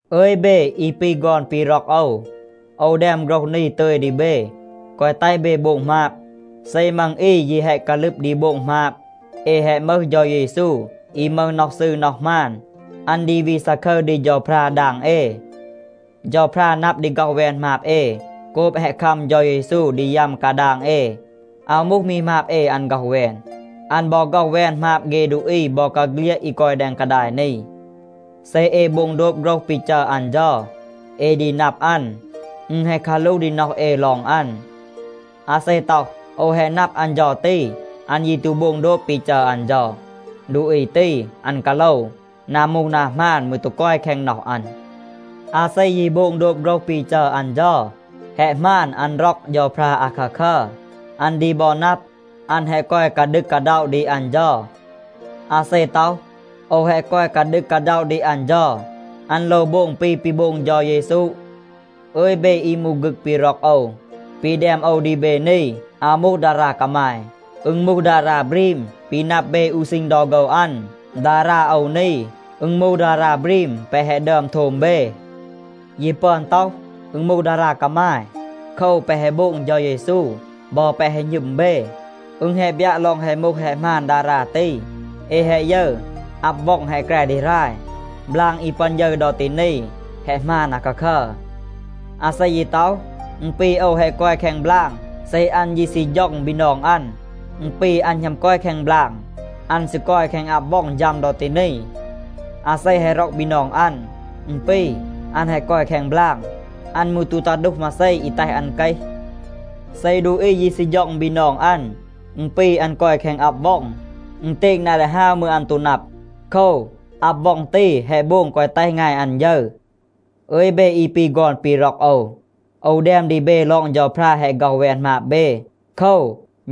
อึย เบ อี ปี ฆอน ปี ร็อก โอว, โอว แดม โฆรห นี ตึย ดี เบ, แกวะ แตห เบ โบง หมาบ. เซ มัง อี ยี แฮะ กาลึบ ดี โบง หมาบ เอ แฮะ มึห เฌา เยซู อี มึห น็อห ซืร น็อห หมาน. อัน ดี วี ซาคึร ดี เฌาพรา ดาง เอ. เฌาพรา นับ ดี ฆ็อห แวน หมาบ เอ โกบ แฮะ คัม เฌา เยซู ดี ยัม กาดาง เอ. อาว มูห มี หมาบ เอ อัน ฆ็อห แวน. อัน บอ ฆ็อห แวน หมาบ เฆ ดูอี บอกาเฆลียด อี กอย แดง กาดาย นี. เซ เอ โบง โดบ โฆรห ปี จัร อัน เฌา, เอ ดี นับ อัน. อึณ แฮะ กาหลูห ดี น็อห เอ ลอง อัน. อาเซ ต็อห, “โอว แฮะ นับ อัน เฌา ตี,” อัน ยี ตู โบง โดบ ปี จัร อัน เฌา, ดูอี ตี, อัน กาโลว. นา มูห นา หมาน มืร ตู กอย แคง น็อห อัน. อาเซ ยี โบง โดบ โฆรห ปี จัร อัน เฌา, แฮะ หมาน อัน ร็อก เฌาพรา อาคาคัร. อัน ดี บอ นับ, อัน แฮะ กอย กาดึก กาด็อะ ดี อัน เฌา. อาเซ ต็อห, “โอว แฮะ กอย กาดึก กาด็อะ ดี อัน เฌา,” อัน โลว โบง ปี ปี โบง เฌา เยซู. อึย เบ อี มูห ฆึก ปี ร็อก โอว, ปี แดม โอว ดี เบ นี, อาว มูห ดารา กามาย. อึณ มูห ดารา บรีม ปี นับ เบ อู ซีณ ดอ โฆว อัน. ดารา โอว นี, อึณ มูห ดารา บรีม แปะ แฮะ ดึอม โทม เบ. ยี ปึอน ต็อห, อึณ มูห ดารา กามาย. โคว, แปะ แฮะ โบง เฌา เยซู บอ แปะ แฮะ หณึม เบ, อึณ แฮะ บยัะ ลอง แฮะ มูห แฮะ หมาน ดารา ตี. เอ แฮะ ยึร, อับ ว็อง แฮะ แกร ดี หราย. บลาง อี ปึอน ยึร ดอ ตี นี, แฮะ หมาน อาคาคัร. อาเซ ยี ต็อห, “อึณ ปี โอว แฮะ กอย แคง บลาง,” เซ อัน ยี ซี ฌ็อง บีนอง อัน, อึณ ปี อัน หณัม กอย แคง บลาง. อัน ซี กอย แคง อับ ว็อง ฌัม ดอ ตี นี. อาเซ แฮะ ร็อก บีนอง อัน, อึณ ปี อัน แฮะ กอย แคง บลาง. อัน มืร ตู ตา ดูห มาเซ อี แตห อัน เกห. เซ ดูอี ยี ซี ฌ็อง บีนอง อัน, อึณ ปี อัน กอย แคง อับ ว็อง. อึณเตณ นา ดี ฮาว มืร, อัน ตู นับ. โคว, อับ ว็อง ตี แฮะ โบง แกวะ แตห งาย อัน ยึร. อึย เบ อี ปี ฆอน ปี ร็อก โอว, โอว แดม ดี เบ ลอง เฌาพรา แฮะ ฆ็อห แวน หมาบ เบ. โคว,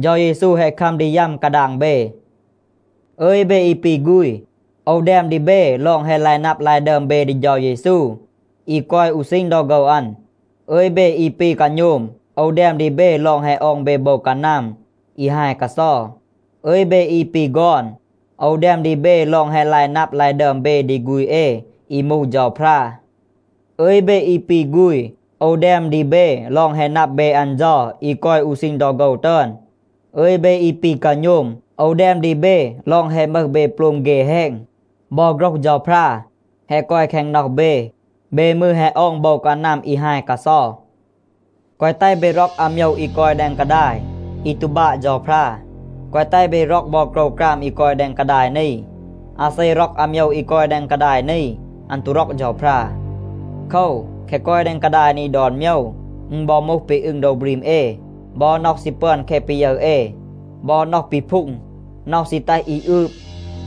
เฌา เยซู แฮะ คัม ดี ยัม กาดาง เบ. อึย เบ อี ปี ฆูณ, โอว แดม ดี เบ ลอง แฮะ ลาย นับ ลาย ดึอม เบ ดี เฌา เยซู อี กอย อู ซีณ ดอ โฆว อัน. อึย เบ อี ปี กาโณม, โอว แดม ดี เบ ลอง แฮะ ออง เบ โบว กานัม อี ฮาย กาเซา. อึย เบ อี ปี ฆอน, โอว แดม ดี เบ ลอง แฮะ ลาย นับ, ลาย ดึอม เบ ดี ฆูณ เอ อี มูห เฌาพรา. อึย เบ อี ปี ฆูณ, โอว แดม ดี เบ ลอง แฮะ นับ เบ อัน เฌา อี กอย อู ซีณ ดอ โฆว ตึอน. อึย เบ อี ปี กาโณม, โอว แดม ดี เบ ลอง แฮะ มึห เบ โปลม เฆ แฮณ. บอ โฆรห เฌาพรา แฮะ กอย แคง น็อห เบ. เบ มืร แฮะ ออง โบว กานัม อี ฮาย กาเซา. แกวะ แตห เบ ร็อก อาโมยว อี กอย แดง กาดาย, อี ตู บาะ เฌาพรา. แกวะ แตห เบ ร็อก บอ โกรวกราม อี กอย แดง กาดาย นี. อาเซ ร็อก อาโมยว อี กอย แดง กาดาย นี, อัน ตู ร็อก เฌาพรา. โคว, แคะ กอย แดง กาดาย นี ดอน โมยว, อึณ บอ มูห ปี อึง โดว บรีม เอ, บอ น็อห ซี ปึอน แคะ ปี ยึร เอ, บอ น็อห ปีพูง, น็อห ซี แตห อี อืบ,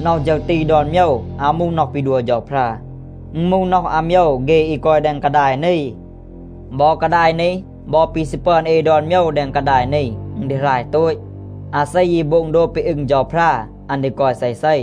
น็อห ฌึร ตี ดอน โมยว อาว มูห น็อห ปี ดัว เฌาพรา. อึณ มูห น็อห อาโมยว เฆ อี กอย แดง กาดาย นี. บอ กาดาย นี บอ ปี ซี ปึอน เอ ดอน โมยว แดง กาดาย นี, อึณ ดี หราย โตต. อาเซ ยี โบง โดบ ปี อึง เฌาพรา, อัน ดี กอย เซเซ.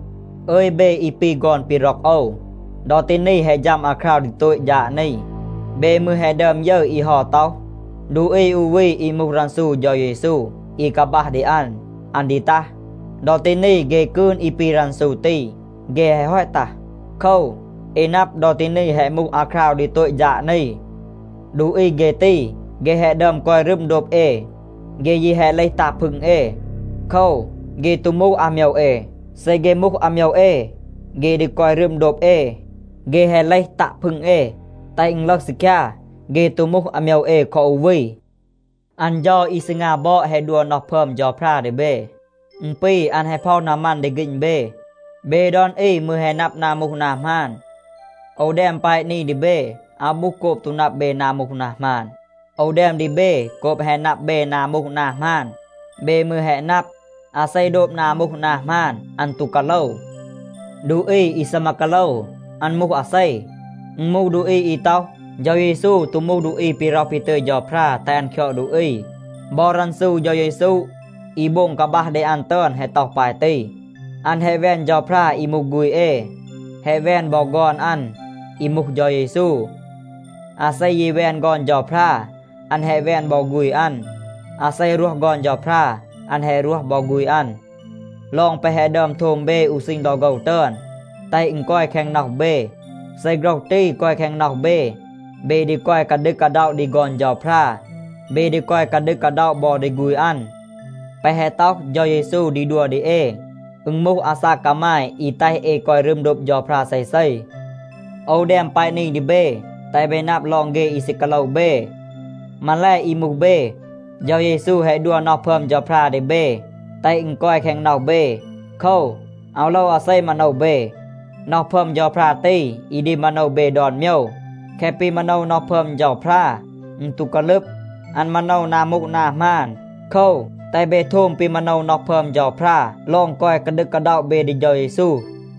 อึย เบ อี ปี ฆอน ปี ร็อก โอว, ดอ ตี นี แฮะ ฌัม อาคราว ดี โตต ฌาด นี. เบ มืร แฮะ ดึอม ยึร อี เฮา ต็อห, ดูอี อู วี อี มูห รันซู เฌา เยซู อี กาบัห ดี อัน, อัน ดี ตัห. ดอ ตี นี เฆ กืน อี ปี รันซู ตี, เฆ แฮะ ฮอต ตัห. โคว, เอ นับ, ดอ ตี นี แฮะ มูห อาคราว ดี โตต ฌาด นี. ดูอี เฆ ตี, เฆ แฮะ ดึอม กอย รึม โดบ เอ. เฆ ยี แฮะ เลห ตัะ พึง เอ. โคว, เฆ ตู มูห อาโมยว เอ. เซ เฆ มูห อาโมยว เอ, เฆ ดี กอย รึม โดบ เอ. เฆ แฮะ เลห ตัะ พึง เอ, แตห อึณ ลึห ซีคยา, เฆ ตู มูห อาโมยว เอ คอ อู วี. อัน เฌา อี ซีงา บอด แฮะ ดัว น็อห พึอม เฌาพรา ดี เบ. อึณ ปี อัน แฮะ พ็อห นามัน ดี ฆีณ เบ. เบ ดอน อี มืร แฮะ นับ นา มูห นา หมาน. โอว แดม แปะ นี ดี เบ, อาว มูห โกบ ตู นับ เบ นา มูห นา หมาน. โอว แดม ดี เบ โกบ แฮะ นับ เบ นา มูห นา หมาน. เบ มืร แฮะ นับ, อาเซ โดบ นา มูห นา หมาน, อัน ตู กาโลว. ดูอี อี ซีมา กาโลว, อัน มูห อาเซ? อึณ มูห ดูอี อี ต็อห, เฌา เยซู ตู มูห ดูอี ปี ร็อห ปี ตึย เฌาพรา แตห อัน คยอด ดูอี. บอ รันซู เฌา เยซู อี โบง กาบัห ดี อัน ตึอน แฮะ ต็อห ปาย ตี. อัน แฮะ แวน เฌาพรา อี มูห ฆูณ เอ, แฮะ แวน บอ ฆอน อัน อี มูห เฌา เยซู. อาเซ ยี แวน ฆอน เฌาพรา, อัน แฮะ แวน บอ ฆูณ อัน. อาเซ รวห ฆอน เฌาพรา, อัน แฮะ รวห บอ ฆูณ อัน. ลอง แปะ แฮะ ดึอม โทม เบ อู ซีณ ดอ โฆว ตึอน, แตห อึณ กอย แคง น็อห เบ. เซ โฆรห ตี กอย แคง น็อห เบ, เบ ดี กอย กาดึก กาด็อะ ดี ฆอน เฌาพรา. เบ ดี กอย กาดึก กาด็อะ บอ ดี ฆูณ อัน. แปะ แฮะ ต็อห เฌา เยซู ดี ดัว ดี เอ, อึณ มูห อาซาก กามาย อี แตห เอ กอย รึม โดบ เฌาพรา เซเซ. โอว แดม แปะ นี ดี เบ, แตห เบ นับ ลอง เฆ อี ซี กาโลว เบ. มาแล, อี มูห เบ, เฌา เยซู แฮะ ดัว น็อห พึอม เฌาพรา ดี เบ แตห อึณ กอย แคง น็อห เบ. โคว, อาว โลว อาเซ มาโนว เบ. น็อห พึอม เฌาพรา ตี อี ดี มาโนว เบ ดอน โมยว. แคะ ปี มาโนว น็อห พึอม เฌาพรา, อึณ ตู กาลึบ. อัน มาโนว นา มูห นา หมาน. โคว, แตห เบ โทม ปี มาโนว น็อห พึอม เฌาพรา ลอง กอย กาดึก กาด็อะ เบ ดี เฌา เยซู.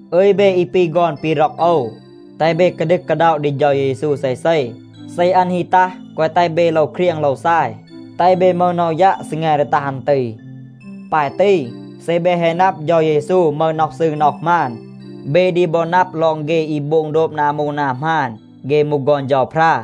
อึย เบ อี ปี ฆอน ปี ร็อก โอว, แตห เบ กาดึก กาด็อะ ดี เฌา เยซู เซเซ. เซ อัน ฮี ตัห, แกวะ แตห เบ โลว เครียง โลว ซาย. แตห เบ มึห น็อห ยัะ ซีแง ดี ตัห อัน ตี. ปาย ตี, เซ เบ แฮะ นับ เฌา เยซู มึห น็อห ซืร น็อห หมาน, เบ ดี บอ นับ ลอง เฆ อี โบง โดบ นา มูห นา หมาน, เฆ มูห ฆอน เฌาพรา.